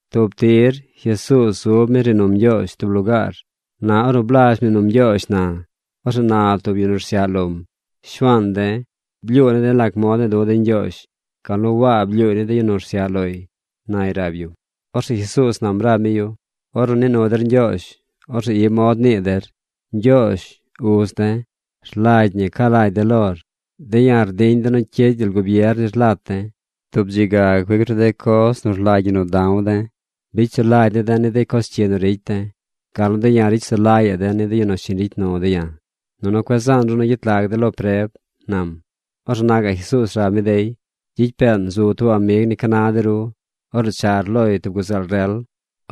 Tub tir Jesuuz zub mi rnii num Ñgyoozh tub lugaar. Na ornu blazh mnii num Ñgyoozh na, orzeꞌ na tub yu nu rsyaꞌ lom: ―Shuaan de̱, blyuu ne̱ de̱ lac mod ne̱e̱ du̱ de̱ Ñgyoozh gal nu Waa blyuuy ni de yu nu rsyaꞌ loy ―nay rab yum. Orzeꞌ Jesuuz nam rab mi yu: ―Ornu nii nu der Ñgyoozh, orzeꞌ i mod nii der: Ñgyoozh, uz de̱, rlagy ñi ca lagy de̱ lor. De̱ ya̱ rdiñ de̱ nu cyid gyel gubier nir lat de̱. Tub dzi ga cuic ru de coz nu rlagy ñi nu da̱w de̱. Bicy sulagy ne̱ de̱ ni de coz cyi nu ricy de̱, gal nu de̱ ya̱ ricy sulagyaꞌ de̱ ni de yu nu shiñ ricy nu de̱ ya̱. Nunu cueꞌ zaan ru nu gyet lag de̱ lo preb ―nam. Orzeꞌ na gaꞌ Jesuuz rab mi dey: ―Gyicy peen zu tub amig ni ca na de ru. Orzeꞌ char loy tub guzeel rel.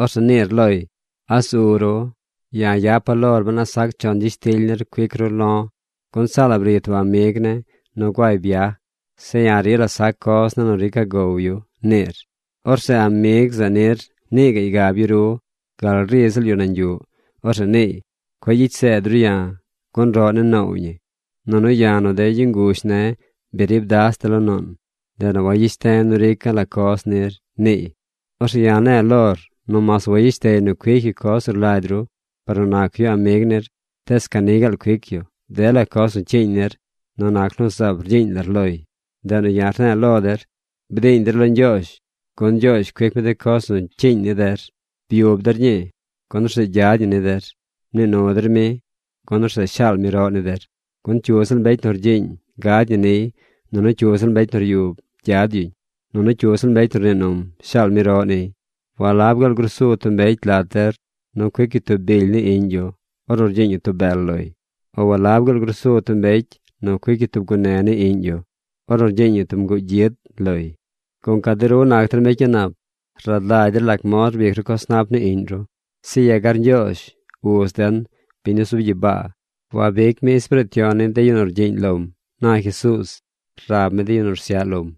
Orzeꞌ niir loy: “¿A zu ru? Ya̱ yapa̱ lor ben a sac chon gyishtily nir cuic ru lo̱. Gun saa la bri tub amig ne̱ nu guay byaj. Zeꞌ ya̱ rila sac coz ne̱ nu rica̱ gow yu”, niir. Orzeꞌ amig zeꞌ nir nii gaꞌy gab yu ru gal ri ziꞌl yu nañ yuꞌ. Orzeꞌ niiy: “Cueꞌ gyicy seed ru ya̱, gun roꞌ ne̱ noow ñi, nunu ya̱ nu de yu nguzh ne̱ bi rib das de̱ lo nuun. Ndeꞌ nu wayeshte̱ nu rica̱ la coz nir”, niiy. Orzeꞌ ya̱ ne̱e̱ lor nu mas wayeshtey nu cuic yu coz nu rlagy ru par nu nac yu amig nir, tees ca ni gaal cuic yu dela coz nu cyiiñ nir nu nac nu zaab rgyiiñ lar loy. Ndeꞌ nu ya̱ rne̱e̱ lo der: Bdiiñ der lo Ñgyoozh, gun Ñgyoozh cuic mi de coz nu cyiiñ ni der. Byub der ñii, gun orzeꞌ gyad ñi ni der. Mnii nu der mi, gun orzeꞌ shaal mi roꞌ ni der. Gun cyu ziꞌl mbecy nu rgyiiñ gad ñi niy. Nunu cyu ziꞌl mbecy nu ryub gyad yuñ. Nunu cyu ziꞌl mbecy nu rnii num shaal mi roꞌ niy. ’¿Walab gaal grusu tub mbecy lat der nu cuic yu tub bily ni iꞌñ yu ornu rgyiiñ yu tub bel loy? O ¿walab gaal grusu tub mbecy nu cuic yu tub gune ni iꞌñ yu ornu rgyiiñ yu nguu gyid loy? Gunca de ru nac der mbecy a̱ꞌ nap rad lagy der lac mod rbic ru coz nap ni iꞌñ ru, zeꞌ yegar Ñgyoozh, uz den, biñ nu zub gyibaa, wabic mi Espiriit Yon ni de yu rgyiiñ lom ―na Jesuuz rab mi de yu nu rsyaꞌ lom.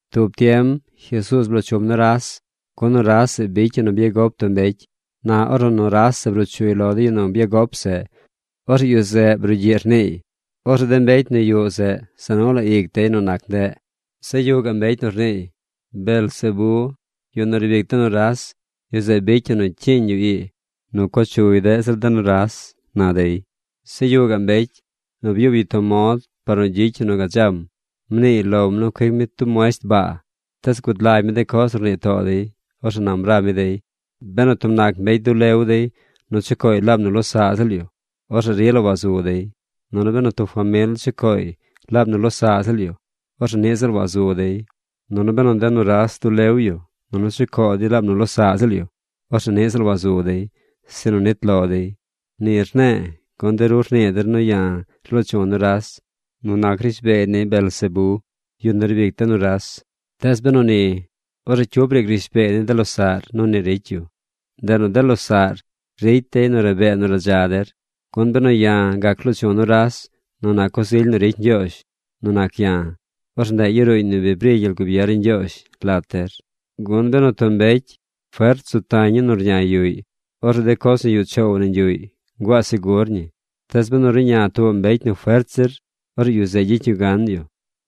Tub tiem Jesuuz bloo chum nuras, gun nuras zeꞌ bicy yu nu byagop tub mbecy. Na ornu nuras bruu chuy lo yu nu byagop zeꞌ, orzeꞌ yu zeꞌ brugyiꞌ rniiy. Orzeꞌ de mbecy nu yuꞌ zeꞌ za nu la ic dey nu nac ndeꞌ. Zeꞌ yuꞌ gaꞌ mbecy nu rniiy: ―Beelzebé, yu nu riib ic de nuras, yu zeꞌ bicy yu nu cyiiñ yu ii nu co chuy deꞌ zir de nuras ―na dey. Zeꞌ yuꞌ gaꞌ mbecy nu byub yu tub mod par nu gyicy yu nu gadzam. Mniiy lom nu cuic mi tub muesht baa. Tees gud lagy mi de coz nu rnii too dey. Orzeꞌ nam rab mi dey: ―Benu tub nac mbecy dulew dey nu chucooy laab nu losaꞌ ziꞌl yu, orzeꞌ rila wazu dey. Nunu benu tub famil chucooy laab nu losaꞌ ziꞌl yu, orzeꞌ niꞌ ziꞌl wazu dey. Nunu benu de nuras dulew yu nunu chucoo dey laab nu losaꞌ ziꞌl yu, orzeꞌ niꞌ ziꞌl wazu dey, sinu nit lo dey. Ni rne̱e̱ gun de ru rnii der nu ya̱ rlo̱o̱ chu̱ nuras nu nac rishbeey ni Beelzebé, yu nu riib ic de nuras. Tees benu ni, orzeꞌ cyu briic rishbeey ni de losaꞌr nu ni ricy yu. Ndeꞌ nu de losaꞌr ricy dey nu rabee nu radza der. Gun benu ya̱ gac loo chu̱ nuras nu nac coz ily nu ricy Ñgyoozh nu nac ya̱, orzeꞌ ndeꞌ yaruuñ nu bi bri gyel gubier ni Ñgyoozh lat der. ’Gun benu tub mbecy fert zu tañ yu nu rñay yuꞌy, orzeꞌ de coz nu yuꞌ choow nañ yuꞌy nguaa segur ñi. Tees benu ruꞌña tuubaꞌ mbecy nu fert zir, orzeꞌ yu zeꞌ gyicy yu gan yu.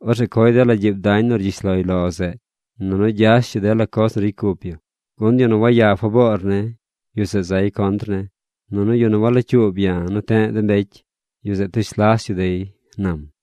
Orzeꞌ coy dela gyiib dañ nu rgyish loy lo zeꞌ. Nunu gyash yu dela coz nu ricy cup yu. ’Gun yu nu waya faboor ne̱, yu zeꞌ zay contr ne̱. Nunu yu nu walocyuub ya̱ nu te̱ꞌ de mbecy, yu zeꞌ tush las yu dey ―nam―.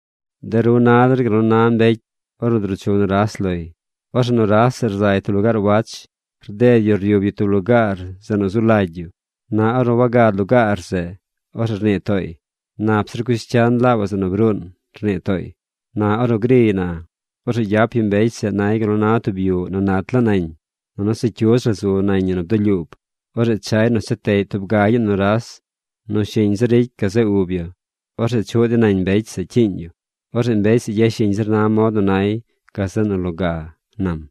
’De ru na der gal na tub mbecy ornu druu chu nuras loy. Orzeꞌ nuras zeꞌ rzay tub lugaar wach. Rded yu ryub yu tub lugaar zeꞌ nu zu lagy yu. Na ornu wagad lugaar zeꞌ, orzeꞌ rnii tooy: “Nap zir cush cyan laabaꞌ zeꞌ nu bruun”, rnii tooy. Na ornu griy na, orzeꞌ gyap yu mbecy zeꞌ nay gal nu na tub yuꞌ nu nat laa nañ. Nunu se cyudz la zu nañ ñi nu bdulyuub. Orzeꞌ chay nu cha teꞌy tub gagyaꞌ nuras nu shiñ zir ricy gazeꞌ ub yu. Orzeꞌ chuꞌ dey nañ mbecy zeꞌ cyiiñ yu. Orzeꞌ mbecy zeꞌ yashiñ zir na mod nu nay gazeꞌ nu loga ―nam.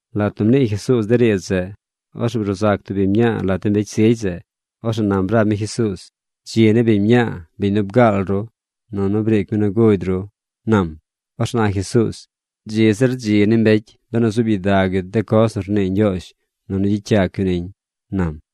Lat nu mnii Jesuuz de riidz zeꞌ, orzeꞌ bruu zac tub biñ mñaa lat de mbecy zigy zeꞌ. Orzeꞌ nam rab mi Jesuuz: ―¡Dzi ni biñ mñaa, biñ nu bgaal ru, nunu briic mi nu gugy ru! ―nam. Orzeꞌ na Jesuuz: ―¡Dzi zir dzi ni mbecy benu zuub gyidag yu de coz nu rnii Ñgyoozh nunu gyicy yac yu niñ! ―nam.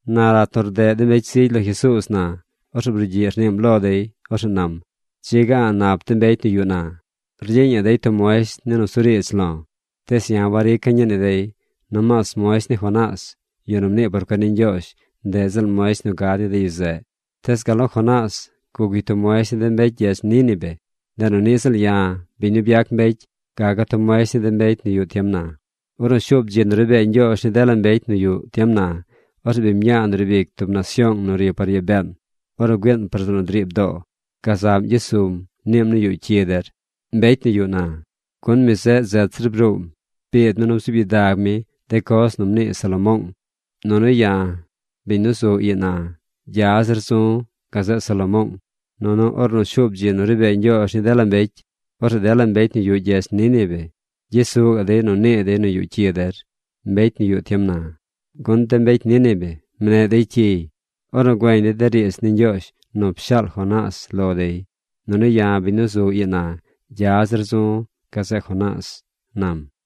Na lat nu rdeꞌ de mbecy zigy lo Jesuuz na, orzeꞌ brugyiꞌ rniim lo dey. Orzeꞌ nam: ―Dzi ga a̱ꞌ nap de mbecy nu yuꞌ na. Rgyiiñaꞌ dey tub muesht ni nusuriidz lo̱, tees ya̱ warica̱ ñii ni dey. Nomaas muesht ni Jonás, yu nu mnii por cuen ni Ñgyoozh, ndeꞌ ziꞌl muesht nu gad ni de yu zeꞌ. Tees gal nu Jonás guc yu tub muesht ni de mbecy gyedz Nínive, ndeꞌ nu niꞌ ziꞌl ya̱, biñ nu byac mbecy, gaca̱ tub muesht ni de mbecy nu yuꞌ tiem na. Ornu shuub dzi nu ri bee Ñgyoozh ni dela mbecy nu yuꞌ tiem na, orzeꞌ biñ mñaa nu riib ic tub nasyoong nu ri par yaa been, ornu güiin par zeꞌ nu driib doo, gazaꞌm gyes sum niim nu yuꞌ cyi der, mbecy nu yuꞌ na. Gun mi zeꞌ zet zir bruum biid mi nu bzuub gyidag mi de coz nu mnii Salomoong. Nunu ya̱, biñ nu zu ii na, gya zir zu̱ gazeꞌ Salomoong. Nunu ornu shuub dzi nu ri bee Ñgyoozh ni dela mbecy, orzeꞌ dela mbecy nu yuꞌ gyedz Nínive gyes su gaꞌ dey nu nii dey nu yuꞌ cyi der mbecy nu yuꞌ tiem na. Gun de mbecy Nínive mneꞌ dey cyiy ornu güeñ dey de riidz ni Ñgyoozh nu pshaal Jonás lo dey. Nunu ya̱ biñ nu zu ii na, gya zir zu̱ gazeꞌ Jonás ―nam―.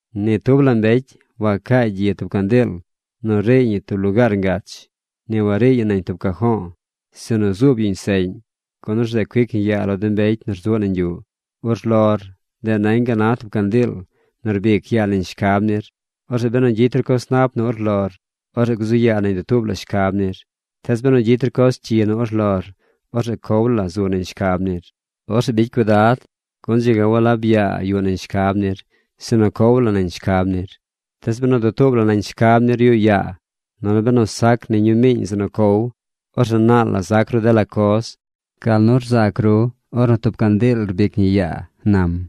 ’Ni tub la mbecy wacaay gyi tub candiil nu riiy ñi tub lugaar ngach. Ni wariiy ñi nañ tub cajo̱o̱, sinu zuub yuñ seꞌñ, gun orzeꞌ cuic ñi yaa lo de mbecy nu rzuꞌ nañ yuꞌ. Urlor, ndeꞌ nañ gal na tub candiil nu rbic yaa nañ shcab nir. Orzeꞌ benu gyicy ru coz nap nu urlor, orzeꞌ gzu yaa nañ dutuub la shcab nir. Tees benu gyicy ru coz cyi nu urlor, orzeꞌ cow la zu nañ shcab nir. Orzeꞌ bicy cuidad, gun dzi ga walab yaa yuꞌ nañ shcab nir, sinu zu cow la nañ shcab nir. Tees benu dutuub la nañ shcab nir yuꞌ yaa nunu benu sac ni ñumiiñ zeꞌ nu cow, orzeꞌ naal la zac ru dela coz, gal nu rzac ru ornu tub candiil rbic ñi yaa ―nam.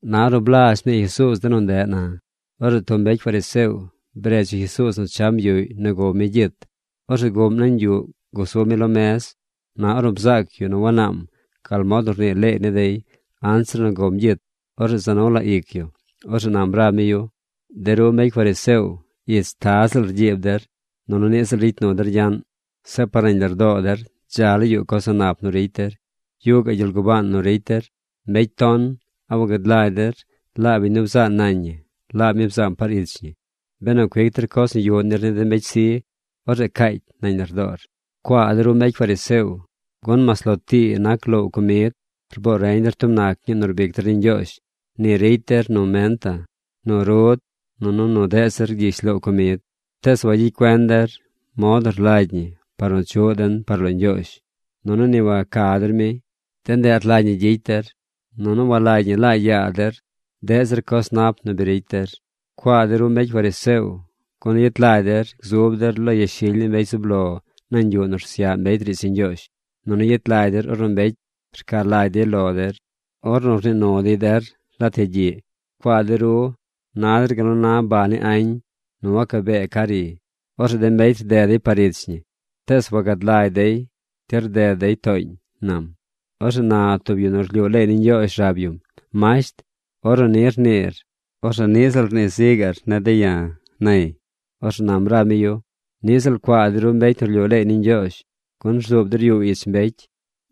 Na ornu blazh mnii Jesuuz de nu ndeꞌ na, orzeꞌ tub mbecy fariseo bredz yu Jesuuz nu cham yuꞌy nu gow mi gyit. Orzeꞌ guꞌm nañ yuꞌ gusub mi lo mez. Na ornu bzaac yu nu wanaam gal mod nu rnii leey ni dey anzir nu gom gyit, orzeꞌ za nu la ic yu. Orzeꞌ nam rab mi yu: ―De ru mbecy fariseo ich ziꞌl taz rgyiib der, nunu niꞌ ziꞌl ricy der nu gyaꞌn. Zeꞌ par nañ lardoo der dza laa yuꞌ coz a̱ꞌ nap nu ricy der. Yuꞌ gaꞌ gyel gubaan nu ricy der. ¡Mbecy ton! ¿A wagad lagy der laab biñ nu bzaa nañ ñi, laab mi bzaam par ich ñi? Benu cuic der coz nu yuꞌ nir ni de mbecy zi, orzeꞌ caacy nañ lardoor. ’¡Cuaa de ru mbecy fariseo! Gun mas lo tii nac loow comid, rboo reñ der tub nac ñii nu rbic der ni Ñgyoozh. Ni ricy der nu menta, nu rud, nunu nu deꞌ zir gyish loow comid. Tees wagyicy cuen der mod nu rlagy ñi par nu chuꞌ den par lo Ñgyoozh, nunu ni waca der mi. De ndeꞌ rlagy ñi gyicy der, nunu walagy ñi laa yaa der deꞌ zir coz nap nu bi ricy der. ’¡Cuaa de ru mbecy fariseo! Gun yet lagy der gzub der lo yashily ni mbecy zub lo nañ yuꞌ nu rsyaꞌ mbecy riidz ni Ñgyoozh. Nunu yet lagy der ornu mbecy ca lagy dey lo der ornu nii nu dey der lat yagyiꞌ. ’¡Cuaa de ru! Na der gal nu na baa ni añ nu wacabee ca ri. Orzeꞌ de mbecy rded dey par ich ñi, tees wagad lagy dey ti rded dey tooñ ―nam. Orzeꞌ na tub yu nu rlyuu leey ni Ñgyoozh rab yum: ―Masht, ornu ni rniir, orzeꞌ niꞌ ziꞌl rnii zi gaꞌr ni de̱ ya̱ ―nay. Orzeꞌ nam rab mi yu: ―¡Niꞌ ziꞌl cuaa de ru mbecy nu rlyuu leey ni Ñgyoozh! Gun rzuub der yuu ich mbecy.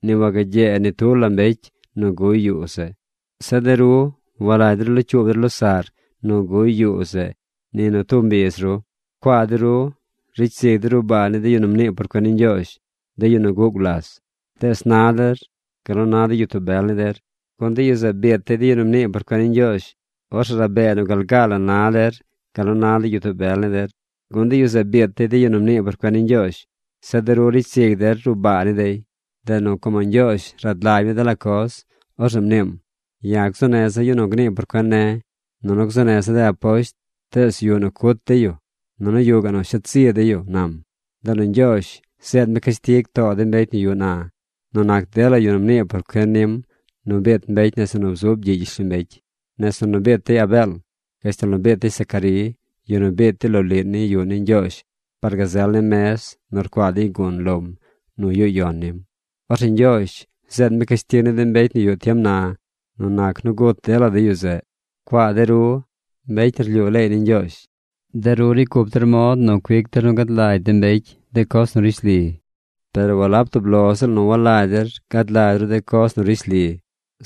Ni wagyee ni tub la mbecy nu guy yuu zeꞌ. Zeꞌ de ru walagy der locyuub der losaꞌr nu guy yuu zeꞌ ni nu tub mbiz ru. ’¡Cuaa de ru! Ricy zig der ruꞌ baa ni de yu nu mnii por cuen ni Ñgyoozh, de yu nu guꞌ gulas. Tees na der gal nu na de gyitoo bel ni der, gun de yu zeꞌ biit dey de yu nu mnii por cuen ni Ñgyoozh. Orzeꞌ rabee nu gal gaa la na der gal nu na gyitoo bel ni der. Gun de yu zeꞌ biit yu de yu nu mnii por cuen ni Ñgyoozh. Zeꞌ de ru ricy zig der ruꞌ baa ni dey. ’Ndeꞌ nu como Ñgyoozh rad lagy mi dela coz, orzeꞌ mniim: “Ya̱ gzuu neza̱ yu nu gnii por cuen ne̱, nunu gzuu neza̱ de aposht. Tees yuꞌ nu cut dey yu. Nunu yuꞌ gaꞌ nu shet zi dey yu”, nam. Ndeꞌ nu Ñgyoozh zeed mi cashtig too de mbecy nu yuꞌ na nu nac dela yu nu mnii por cuen nim nu biit mbecy nese nu bzub gyiꞌ gyishlombecy. Nese nu biit dey Abeel, gashtal nu biit dey Zacarí, yu nu biit dey loliꞌ ni yuꞌ ni Ñgyoozh par gazel ni mez nu rcuaa der gun lom nu yuꞌ yon nim. Orzeꞌ Ñgyoozh zeed mi cashtig ni de mbecy nu yuꞌ tiem na nu nac nu gut dela de yu zeꞌ. ’¡Cuaa de ru, mbecy nu rlyuu leey ni Ñgyoozh! De ru ricy cup der mod nu cuic der nu gad lagy de mbecy de coz nu rishli. Per walab tub lo ziꞌl nu walagy der gad lagy ru de coz nu rishli,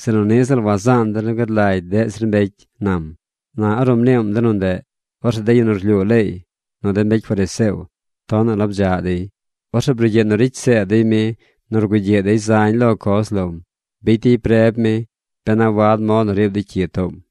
sinu niꞌ ziꞌl wazaan der nu gad lagy deꞌ zir mbecy ―nam. Na ornu mniim de nu ndeꞌ, orzeꞌ de yu nu rlyuu leey, nu de mbecy fariseo tonaꞌ la bdzaꞌ dey. Orzeꞌ brugyiꞌ nu ricy seed dey mi nu rgugyiꞌ dey zañ lo coz lom. Bicy dey preb mi ben a wad mod nu riib dey cyi toom.